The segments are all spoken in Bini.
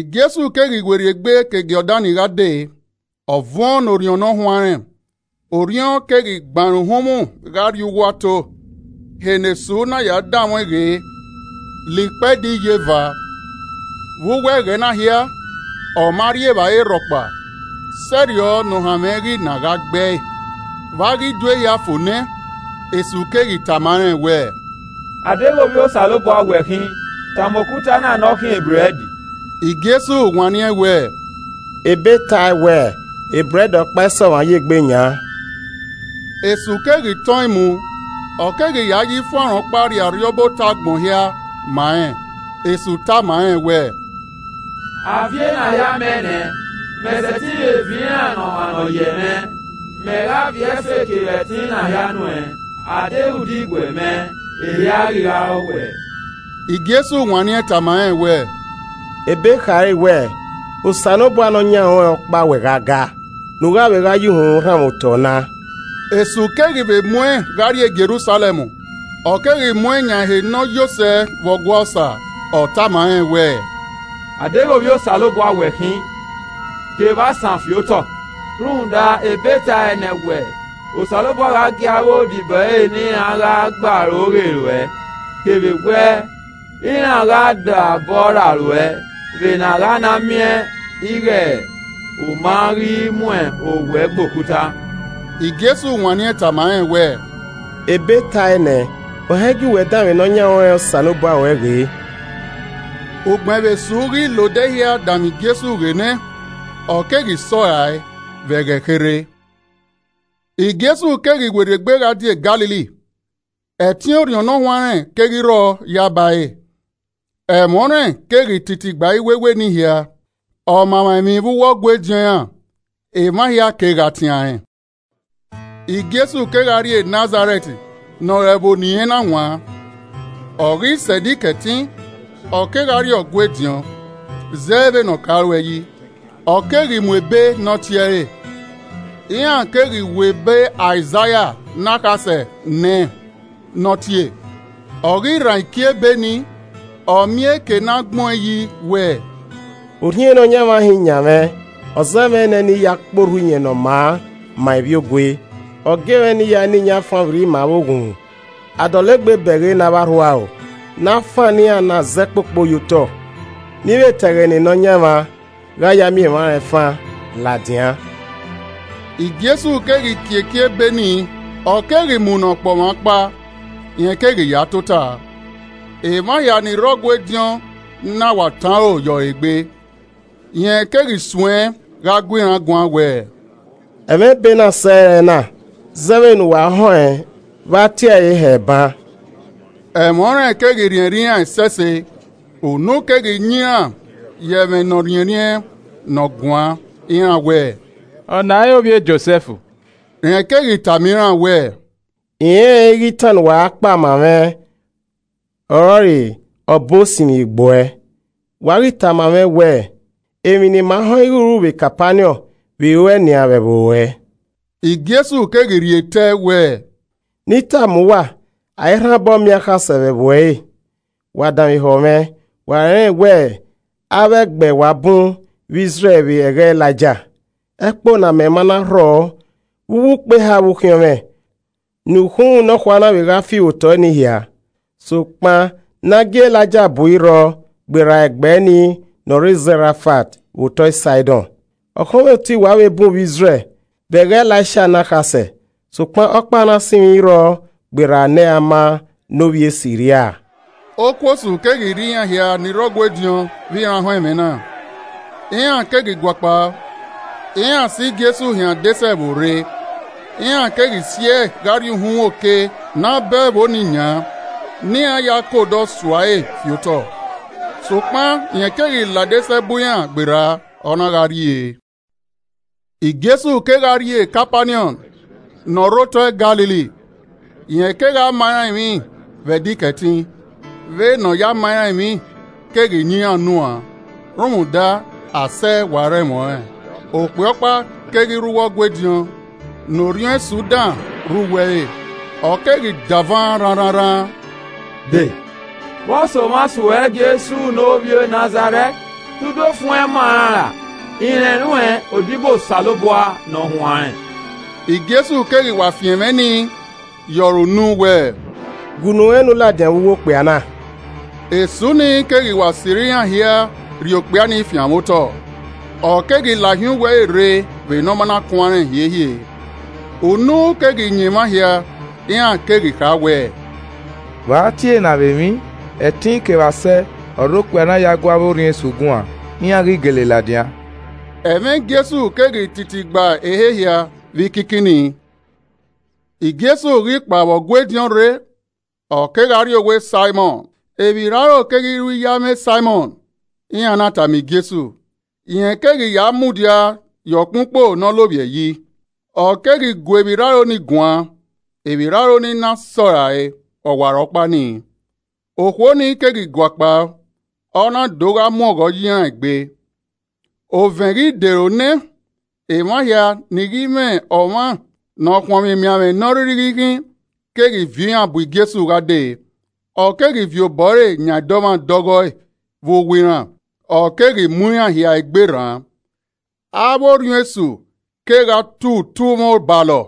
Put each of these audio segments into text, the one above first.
Jesu keghi werriegbe ke Jọdan gha dee, Ọ vuọn ne Orhiọn Ne ọ huanrẹn, Orhiọn keghi gban ẹre uhunmwu gha rrie uwu ato. Ehe ne Esu na ya danmwẹ ọẹn ghe la ikpẹdẹ iyeva. Vbe uwu ẹghẹ na hia, ọ ma rri evbare rhọkpa, sẹrriọ ne ohanmwẹ ghi na gha gbe ẹe vbe a ghi do ehia fo nẹ. Esu keghi tama rẹn wẹ, “A deghẹ Ovbi Osanobua wẹ khin, tama okuta na ne ọ khian ebrẹd.” Jesu wanniẹn wẹẹ, “Ebe tae wẹẹ, ‘Ebrẹd ọkpa i sẹ ọmwa ye egbe yan.’” Esu keghi tọn ẹn mu, ọ keghi ya ye ifuanro ọkpa rhie arriọba otọ agbọn hia ma rẹn. Esu Tama rẹn wẹẹ, “A viọ ena hia mẹ nẹ, mẹ sẹtin vbe viọ iran ne ọmwa ne ọ yẹ mwẹ, Mẹ gha viọ ẹfe kevbe ẹtin na hia nuẹn. A deghẹ u diguẹ mẹ, ehia ghi gha re ọwuẹ.” Jesu wanniẹn tama rẹn wẹẹ, “Ebe khare wẹẹ, ‘Osanobua Nọyan ruẹn ọkpa uwẹ gha gaa, ne u gha vbe gha ye uhunmwu rhanmwẹ otọ na!’” Esu keghi vbe mu ẹn gha rrie Jerusalẹm, ọ keghi mu ẹn yan ehe ne ọ yo sẹ vbe Ọgua Osa, ọ tama rẹn wẹẹ, “A deghẹ Ovbi Osanobua wẹ khin, ke evba san fi otọ. Rhunmwuda Ebe tae nẹ wẹẹ, ‘Osanobua gha gie avbe odibo ẹre ne iran gha gbe aro ghe ruẹ,’ kevbe wẹẹ, ‘Iran gha da obọ rra ruẹ vbene a gha na miẹn ighe u ma ghi mu owẹ gbe okuta.’” Jesu wanniẹn tama rẹn wẹẹ, “Ebe tae ne ‘Ohan igie uwẹ danmwẹ nọyan ruẹn Osanobua ruẹ ghe.’” Ugbẹn vbe Esu ghi la odẹ hia danmwẹ Jesu ghe nẹ, ọ keghi sẹ ọ rae vbe ẹghẹ kherhe. Jesu keghi werriegbe gha die Galili. Ẹtin Orhiọn Ne Ọ Huanrẹn keghi rrọọ yaba ẹre. Ẹmwẹ ọnrẹn keghi titi gba iwewe nii hia. Ọma emwa emwi vbe uwu Ọgua ediọn iran, emwa hia kegha tian rẹn. Jesu kegha rrie Nazarẹt ne ọre ẹvbo ne irẹn na wan, ọ ghi sẹ Ẹdẹ Ikẹtin, ọ kegha rrie Ọgua ediọn. Zẹ vbe ne ọ ka ru yi, ọ keghi mu ebe ne ọ tie ẹre. Iran keghi we ebe Aizaia ne akhasẹ nẹẹn ne ọ tie, ọ ghi rhan iki ebe ni, ọ miẹn eke ne a gbẹn ọẹn yi wẹẹ: “Orhiọn Nọyaẹnmwa hin yan mwẹ. Ọ zẹ mwẹ nẹ ne I ya kpe orhu Iyẹn Ne ọ maa ma ivbiogue, ọ gie mwẹ ne I ya na iyẹn afanvbirri ma avbe oghunmwu, a dọlegbe bẹghe ne avbe arhuaro, ne afannọ iran na zẹ kpokpo ye otọ, ne I vbe ta ẹghẹ ne Nọyaẹnmwa gha ya miẹn emwa rẹn fan ladian.” Jesu keghi kie iki ebe ni, ọ keghi mu ne ọkpọmwa ọkpa, rẹn keghi ya tota. Emwa hia ni rre Ọgua ediọn na wa tọn aro ye ọre egbe. Rẹn keghi suẹn gha gu iran guan wẹẹ, “Ẹmwẹ ebe na sẹe ẹrẹna zẹ vbene uwa họn ẹn vbe a tie ẹre hẹ ban.” Ẹmwẹ ọnrẹn keghi rhiẹnrhiẹn iran ẹsẹse, unu keghi yan iran ye ẹmwẹ, nọ rhiẹnrhiẹn ne ọ guan, iran wẹẹ “Ọna i re ovbi e Josẹf?” Rẹn keghi tama iran wẹẹ, “I rẹnrẹn ighe itan ne uwa ra kpa ma mwẹ ọrọre ‘Ọbo sinmwi egbu ẹ’ Wa ghi tama mwẹ wẹẹ, ‘Emwi ne ima họn ẹn ighe u ru vbe Kapaniọn, vbe ruẹe nian vbe ẹvbo ruẹ.’” Jesu keghi rhie tẹe wẹẹ, “Ne I tama uwa, a i rhan obọ miẹn akhasẹ vbe ẹvbo ẹre. Wa danmwehọ mwẹ, wa rẹnrẹn wẹ avbe ẹgbẹ wa bu vbe Izrẹl vbe ẹghẹ Elaija, ẹkpo ne amẹ ma na rhọ vbe ukpo eha vbe ukhiọnmwẹ, ne ukhunmwu nọkhua na vbe gha fi vbe otọe nii hia. Sokpan ne a gie Elaija bu i rrọọ gberra ẹgbẹ nii ne ọ rre Zẹrafat vbe otọe Saidọn. Ọkhọnmwoti wa vbe bun vbe Izrẹl vbe ẹghẹ Elaisia ne akhasẹ, sokpan ọkpa ne a sinmwi i rrọọ gberra Naaman ne ovbi e Siria.” Okuosu keghi rri iran hia ni rre Ọgua ediọn vbe iran họn ẹmwẹ na. Iran keghi guakpao, iran si Jesu hin adesẹ ẹvbo rre iran keghi si ẹe gha rrie uhunmwu oke ne a bọ ẹvbo ni yan ne iran ya ke odọ sua ẹre fi otọ. Sokpan rẹn keghi la adesẹ ẹbu iran gberra, ọ na gha rrie. Jesu kegha rrie Kapaniọn ne ọ rre otọ Galili, rẹn kegha ma iran emwi vbe Ẹdẹ Ikẹtin. Vbe ne ọ ya ma iran emwi keghi yan iran unuan rhunmwuda asẹ wa rre ẹmwẹ ọnrẹn. Okpia ọkpa keghi rre uwu Ọgua ediọn ne orhiọn esu dan rre uwu ẹre, ọ keghi davan rhanrhananrhan: “De! vbọso mwa suẹ Jesu ne ovbi e Nazarẹt? Te u do fuẹn ima an ra? I rẹn ruẹn, odibo Osanobua ne ọ huanrẹn!” Jesu keghi wa fian ẹmwẹ nii ye ọre unu wẹẹ, “Gue unu ruẹn ne u ladian vbe uwu okpia na.” Esu nii keghi wa sirra iran hia rhie okpia nii fianmwẹ otọ, ọ keghi lahin uwu ẹre rre vbe ne ọ ma na kuanrẹn hiehie. Unu keghi yan emwa hia, iran keghi kha wẹ, “Vbe a tie ena vbe emwi? Ẹtin kevbe asẹ ọre okpia na ya gu avbe orhiọn esu guan, iran ghi gele ladian.” Ẹmwẹ Jesu keghi titi gba ehe hia vbe ikinkin nii. Jesu ghi kpao vbe ọgua ediọn rre, ọ kegha rrie owa Saimọn. Emwirraro keghi ru iye amwẹ Saimọn, iran na tama Jesu. Rẹn keghi ya mudia ye ọkpẹn ukpo ne ọ lovbiẹ yi, ọ keghi gu emwirraro ni guan, Emwirraro ni na sẹrae, ọwarọkpa nii, okhuo ni keghi guakpao, ọ na do gha mu ọghọ ye iran egbe. Ovẹn ghi dero nẹ, emwa hia ni ghi mwẹ ọmwa ne ọ khuọnmwi emianmwẹ ne ọ rhirhi ghi khin keghi viọ iran bu Jesu gha dee, ọ keghi viọ Obọ ẹre yan dọmwadẹ ọghọe vbe uwu iran, ọ keghi mu iran hia egbe rran. Avbe orhiọn esu kegha tu utumwẹ obalọ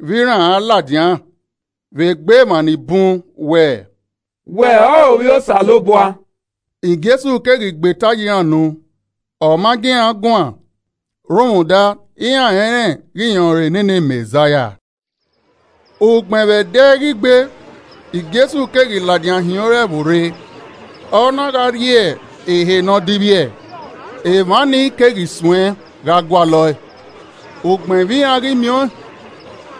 vbe iran a ladian vbe egbe emwa ni bun wẹ, “Wẹ ọrọre Ovbi Osanobua.” Jesu keghi gbe eta ye iran unu, ọ ma gie iran guan rhunmwuda iran rẹnrẹn ighẹ rẹn ọrọre nene Mẹzaia. Ugbẹn vbe ẹdẹ ghi gbe, Jesu keghi ladian hin ore ẹvbo rre, ọ na gha rrie ehe ne ọ divbiẹ. Emwa nii keghi suẹ gha gualọ ẹe, ugbẹn vbe iran ghi miẹn ọẹn,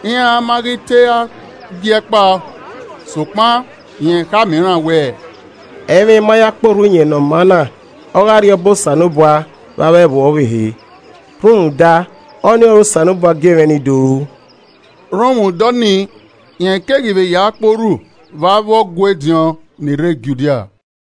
iran ma ghi te ra gie ẹe kpao. Sokpan rẹn khama iran wẹẹ, “Ẹ i mwẹ I ma ya kpe orhu Iyẹn Ne ọ maa na ọghe Arriọba Osanobua vbe avbe ẹvbo ọvbehe rhunmwuda, ọnii ọre Osanobua gie mwẹ ne I do ru.” Rhunmwuda ọnii, rẹn keghi vbe ya kpe orhu vbe avbe Ọgua ediọn ni rre Judia.